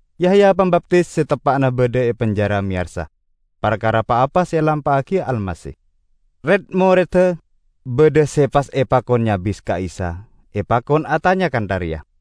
Yahya Pambaptis se teppa'na badha e penjara meyarsa parkara pa-apa se elampa'agi Almasih. Red-moredda badha se pas epakon nyabis ka Isa epakon atanya kantha reya,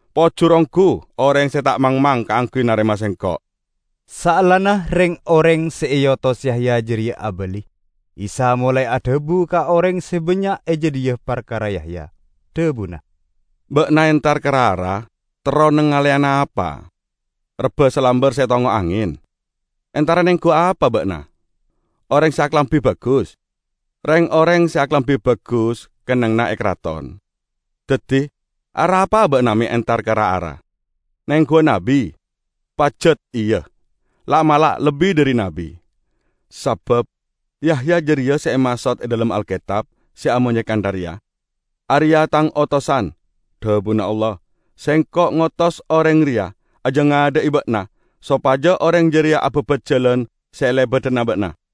Pojur onggu oreng se ta' mangmang kaangguy narema Sengko'!" Saellana reng-oreng se eotos Yahya jareya abali, Isa molae adhabu ka oreng se bannya' e jadhiya parkara Yahya, dhabuna, "Ba'na entar ka ra-ara terro nangaleyana apa? Rebba salambar se etongngo' angen? Entara nenggu apa ba'na? Oreng se akalambi bagus? Reng-oreng se akalambi bagus kennengnganna e karaton! Daddi arapa'a ba'na me' entar ka ra-ara? Nengguwa nabbi? Pajat iya, la'-mala' lebbi dhari nabbi. Sabab Yahya jareya se emaksod e dhalem Alketab se amonye kantha reya: 'Areya' Tang otosan, dhabuna Allah, Sengko' ngotos oreng reya ajangadha'i ba'na sopaja oreng jareya ababat jalan se elebadana ba'na.'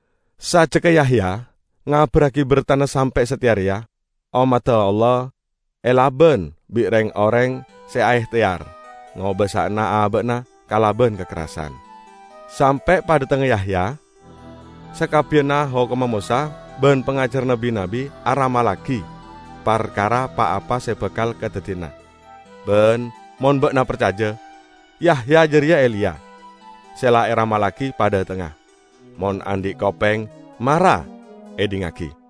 Sajjegga Yahya ngabarragi bertana sampe' sateya reya, ommadda Allah elaban bi' reng-oreng se aehteyar ngobasa'ana aba'na kalaban kakerrasan. Sampe' padhatengnga Yahya, sakabbiyanna hokomma Mosa ban pangajaranna bi-nabbi aramallagi parkara pa-apa se bakal kadaddiyana. Ban mon ba'na parcaja, Yahya jareya Eliya, se la eramallagi padhatengnga. Mon andhi' kopeng, mara edhingngagi!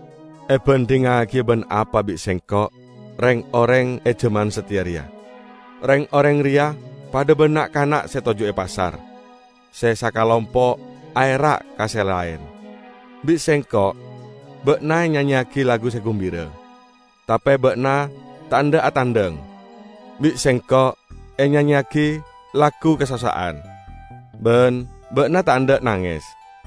Ebandhingngagiya ban apa bi' Sengko' reng-oreng e jaman sateya reya? Reng-oreng reya padha ban na'-kana' se toju' e pasar. Se sakalompo' aera' ka se laen, 'Bi' sengko' ba'na enyanyeyagi lagu se gumbira, tape ba'na ta' endha' atangdang! Bi' sengko' enyanyeyagi lagu kasossa'an, ban ba'na ta' endha' nanges!'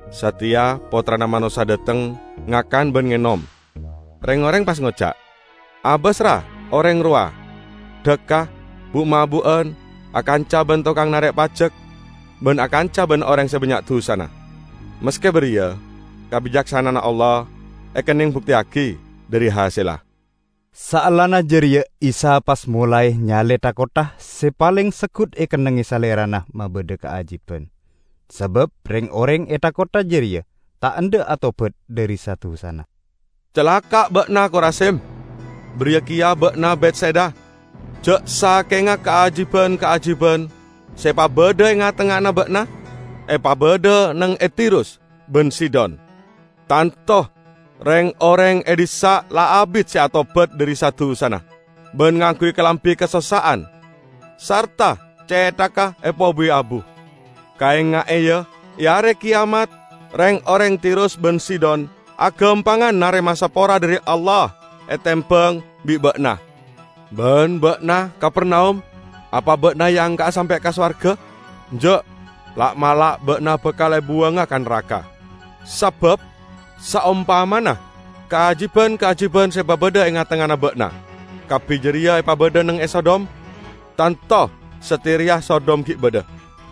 Sateya Pottrana Manossa dhateng, ngakan ban ngenom; reng-oreng pas ngoca', 'Abas, ra, oreng rowa! Dhakka, bu'-mabu'an, akanca ban tokang narek pajek ban akanca ban oreng se bannya' dusana.' Maske bariya, kabicaksana'anna Allah ekenneng bukteyagi dhari hasella." Saellana jareya Isa pas molae nyale tha-kottha se paleng seggut ekennengnge Salerana mabadha kaajiban. Sabab reng-oreng e tha-kottha jareya ta' endha' atobat dhari sa-dusana. "Calaka' ba'na, Korazim! Bariya keya ba'na, Betsaida! Ja' sakenga kaajiban-kaajiban se epabadha e nga'-tengnga'anna ba'na epabadha neng e Tirus ban Sidon, tanto reng-oreng e dhissa' la abit se atobat dhari sa-dusana ban ngangguy kalambi kasossa'an sarta cethagga epobuwi abu. Kaenga'e, ya, e Are Keyamat reng-oreng Tirus ban Sidon agampangan narema sapora dhari Allah etembang bi' ba'na! Ban ba'na, Kapernaum! Apa ba'na eangka'a sampe' ka sowarga? Enja'! La'-mala' ba'na bakal ebuwanga ka naraka! Sabab saompamana kaajiban-kaajiban se epabadha e nga'-tengnga'anna ba'na kabbi jareya epabadha neng e Sodom, tanto sateya reya Sodom gi' badha!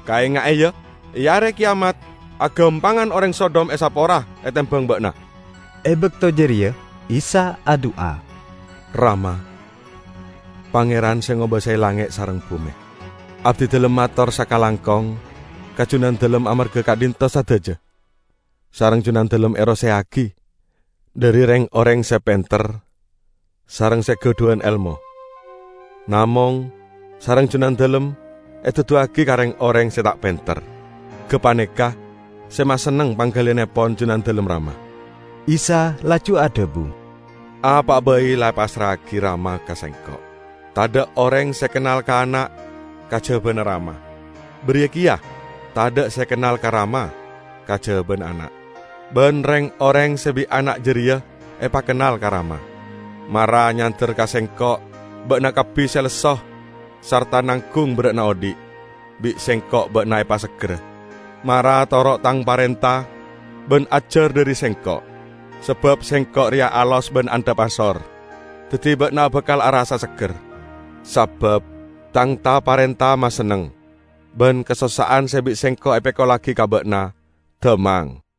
Kaenga'e, ya, e Are Keyamat, agampangan oreng Sodom esapora etembang ba'na!" E bakto jareya Isa adu'a, "Rama, Pangeran se ngobasae langnge' sareng bume! Abdidalem mator sakalangkong ka Junandalem amarga ka'dhinto' sadaja sareng Junandalem eroseya'agi dhari reng-oreng se penter sareng se gadhuwan elmo, namong sareng Junandalem eduduwagi ka reng-oreng se ta' penter. Gapaneka se masenneng panggaliyannepon Junandalem, Rama." Isa laju adhabu, "Apa'a bai la epassra'agi Rama ka Sengko'. Tadha' oreng se kennal ka Ana', kajabana Rama. Bariya keya tadha' se kennal ka Rama kajabana Ana', ban reng-oreng se bi' Ana' jareya epakennal ka Rama. Mara nyander ka Sengko' ba'na kabbi se lesso, sarta nanggung berra'na odhi'; bi' Sengko' ba'na epaseggerra. Mara toro' Tang parenta ban ajar dhari Sengko'. Sabab Sengko' reya alos ban andhap asor, daddi ba'na bakal arassa'a segger. Sabab Tang ta-parenta masenneng, ban kasossa'an se bi' Sengko' epekollagi ka ba'na dhammang."